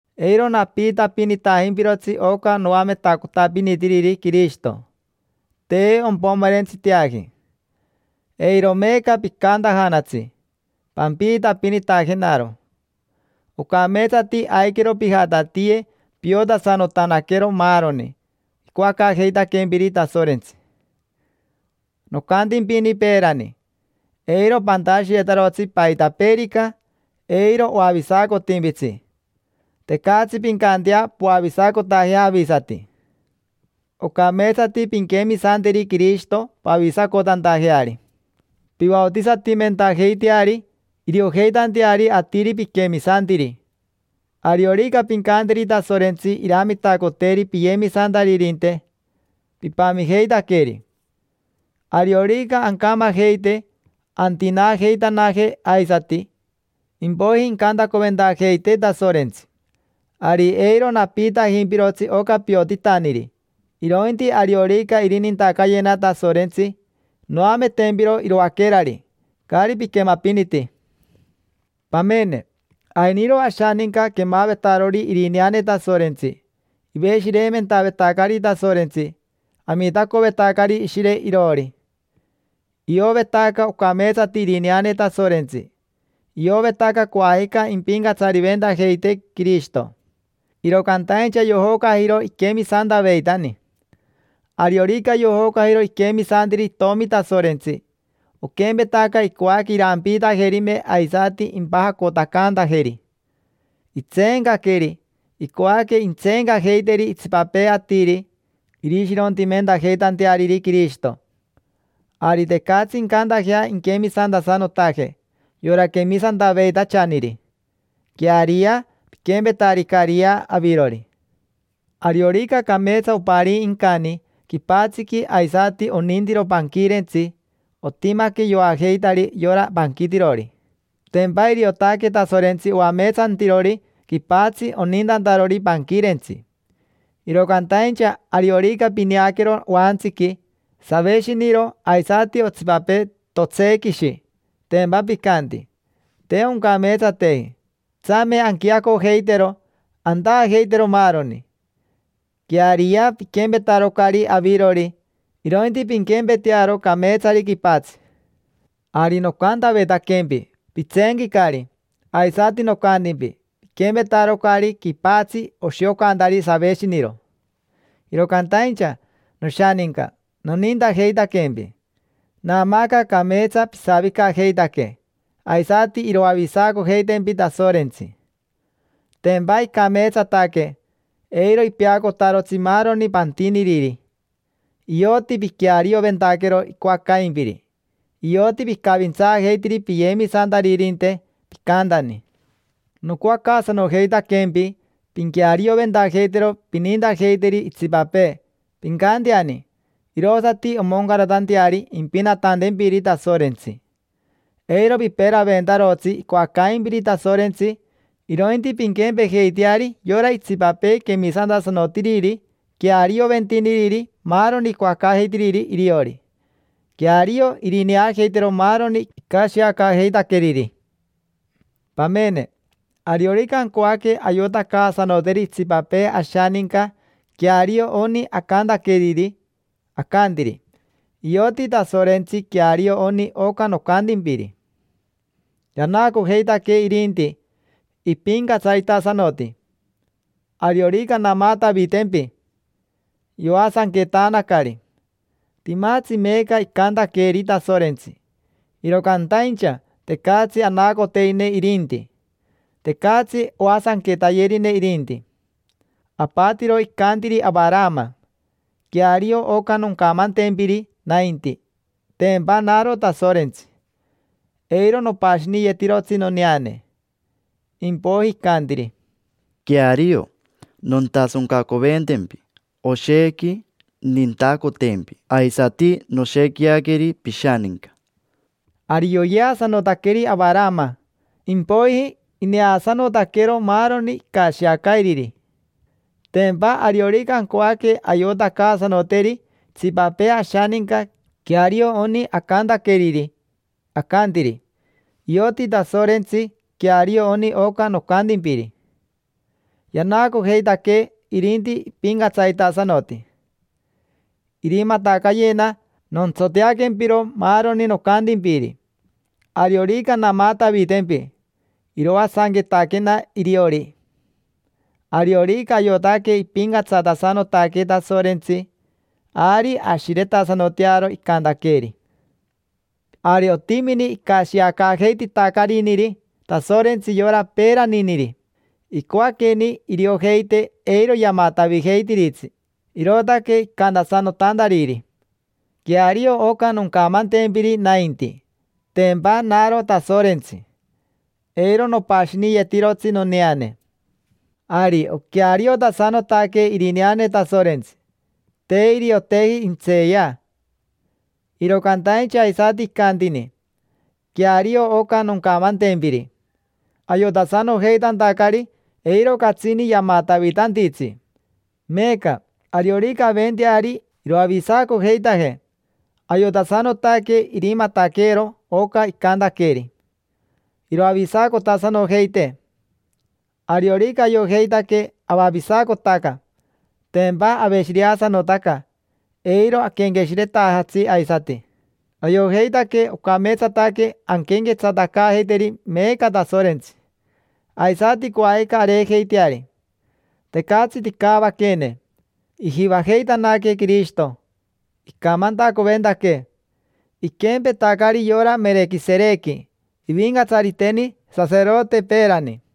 Eiro napiitapinitajimpirotsi oca noametacotapinitiriri Quirishito: te ompomerentsiteaji. Eiro meeca picantajanatsi: “Pampiitapinitajenaro”. Ocameetsati aiquero pijatatiye piotasanotanaquero maaroni icoacaajeitaquempiri Tasorentsi. Nocantimpini peerani: “Eiro pantashiyetarotsi paitapeerica, eiro oavisacotimpitsi: tecatsi pincantea poavisacotajea avisati. Ocameetsati pinquemisanteri Quirishito pavisacotantajeari. Pivaotisatimentajeiteari iriojeitanteari atiri piquemisantiri. Ariorica pincanteri Tasorentsi iramitacoteri piyemisantaririnte, pipamijeitaqueri. Ariorica ancamajeite antinaajeitanaje aisati, impoiji incantacoventajeitee Tasorentsi”. Ari eiro napiitajimpirotsi oca piotitaniri, irointi ariorica irinintacayena Tasorentsi, noametempiro iroaquerari, caari piquemapiniti. Pamene. Ainiro ashaninca quemavetaroniri irineane Tasorentsi, iveshireimentavetacari Tasorentsi, amitacovetacari Ishire iroori. Iovetaca ocameetsati irineane Tasorentsi; iovetaca coajica impincatsariventajeitee Quirishito. Iro cantaincha yojocajiro iquemisantaveitani. Ariorica yojocajiro iquemisantiri Itomi Tasorentsi, oquempetaca icoaque irampiitajerime aisati impajacotacantajeri. Itseencaqueri, icoaque intseencacaajeiteri itsipapee atiri, irishirontimentajeitanteariri Quirishito. Ari tecatsi incantajea inquemisantasanotaje yora quemisantaveitachaniri. Queariyea, piquempetaricariyea avirori. Ariorica cameetsa oparii incani quipatsiqui aisati onintiro panquirentsi, otimaque yoajeitari yora panquitirori. Tempa iriotaque Tasorentsi oameetsantirori quipatsi onintantarori panquirentsi. Iro cantaincha ariorica pineaquero oantsiqui saveshiniro aisati otsipapee totsequishi, tempa picanti: “Te oncameetsateji, tsame anquiacojeitero, antaajeitero maaroni”. Queariyea, piquempetarocari avirori, irointi pinquempetearo cameetsari quipatsi. Ari nocantavetaquempi: “Pitseenquicari”, aisati nocantimpi: “Piquempetarocari quipatsi oshiocantari saveshiniro”. Iro cantaincha, noshaninca, nonintajeitaquempi. Naamaaca cameetsa pisavicajeitaque, aisati iroavisacojeitempi Tasorentsi. Tempa icameetsataque, eiro ipeacotarotsi maaroni pantiniriri: ioti piquearioventaquero icoacaimpiri, ioti picavintsaajeitiri piyemisantaririnte, picantani. Nocoacaasanojeitaquempi pinquearioventajeitero pinintajeiteri itsipapee, pincanteani, irosati omoncaratanteari impinatantempiri Tasorentsi. Eiro piperaventarotsi icoacaimpiri Tasorentsi, irointi pinquempejeiteari yora itsipapee quemisantasanotiriri, quearioventiniriri maaroni icoacaajeitiriri iriori. Queario irineajeitero maaroni icashiacaajeitaqueriri. Pamene, ariorica ancoaque ayotacaasanoteri itsipapee ashaninca queario oni acantaqueriri, acantiri: “Ioti Tasorentsi queario oni oca nocantimpiri. Yanaacojeitaquee irinti, ipincatsaritasanoti. Ariorica namatavitempi, yoasanquetanacari”. Timatsi meeca icantaqueeri Tasorentsi, iro cantaincha tecatsi anacoterine irinti, tecatsi oasanquetayerine irinti. Apatiro icantiri Avarama: “Queario oca noncamantempiri nainti, tempa naro Tasorentsi: eiro nopashiniyetirotsi noneane”. Impoiji icantiri: “Queario, nontasoncacoventempi, oshequi nintacotempi; aisati noshequiaqueri pishaninca”. Ari yoyeasanotaqueri Avarama, impoiji ineasanotaquero maaroni icashiacairiri. Tempa ariorica ancoaque ayotacaasanoteri itsipapee ashaninca queario oni acantaqueriri, acantiri: “Ioti Tasorentsi queario oni oca nocantimpiri. Yanaacojeitaquee irinti ipincatsaritasanoti. Irimatacayena nontsoteaquempiro maaroni nocantimpiri. Ariorica namatavitempi, iroasanquetaquena iriori”. Ariorica ayotaque ipincatsatasanotaque Tasorentsi, ari ashiretasanotearo icantaqueeri. Ari otimini icashiacaajeititacariniri Tasorentsi yora peeraniniri. Icoaqueni iriojeite eiro yamatavijeitiritsi, irootaque icantasanotantariri: “Queario oca noncamantempiri nainti, tempa naro Tasorentsi: eiro nopashiniyetirotsi noneane”. Ari oqueariotasanotaque irineane Tasorentsi: te irioteji intseeya. Iro cantaincha aisati icantini: “Queario oca noncamantempiri”, ayotasanojeitantacari eiro catsini yamatavitantitsi. Meeca, ariorica aventeari iroavisacojeitajee, ayotasanotaque irimataqueero oca icantaqueeri: iroavisacotasanojeitee. Ariorica ayojeitaque avavisacotaca, tempa aveshireasanotaca, eiro aquenqueshiretajatsi aisati. Ayojeitaque ocameetsataque anquenquetsatacaajeiteri meeca Tasorentsi, aisati coajica areejeiteari: tecatsi ticavaqueene. Ijivajeitanaquee Quirishito, icamantacoventaquee: iquempetacari yora Merequiserequi, ivincatsariteni saserote peerani.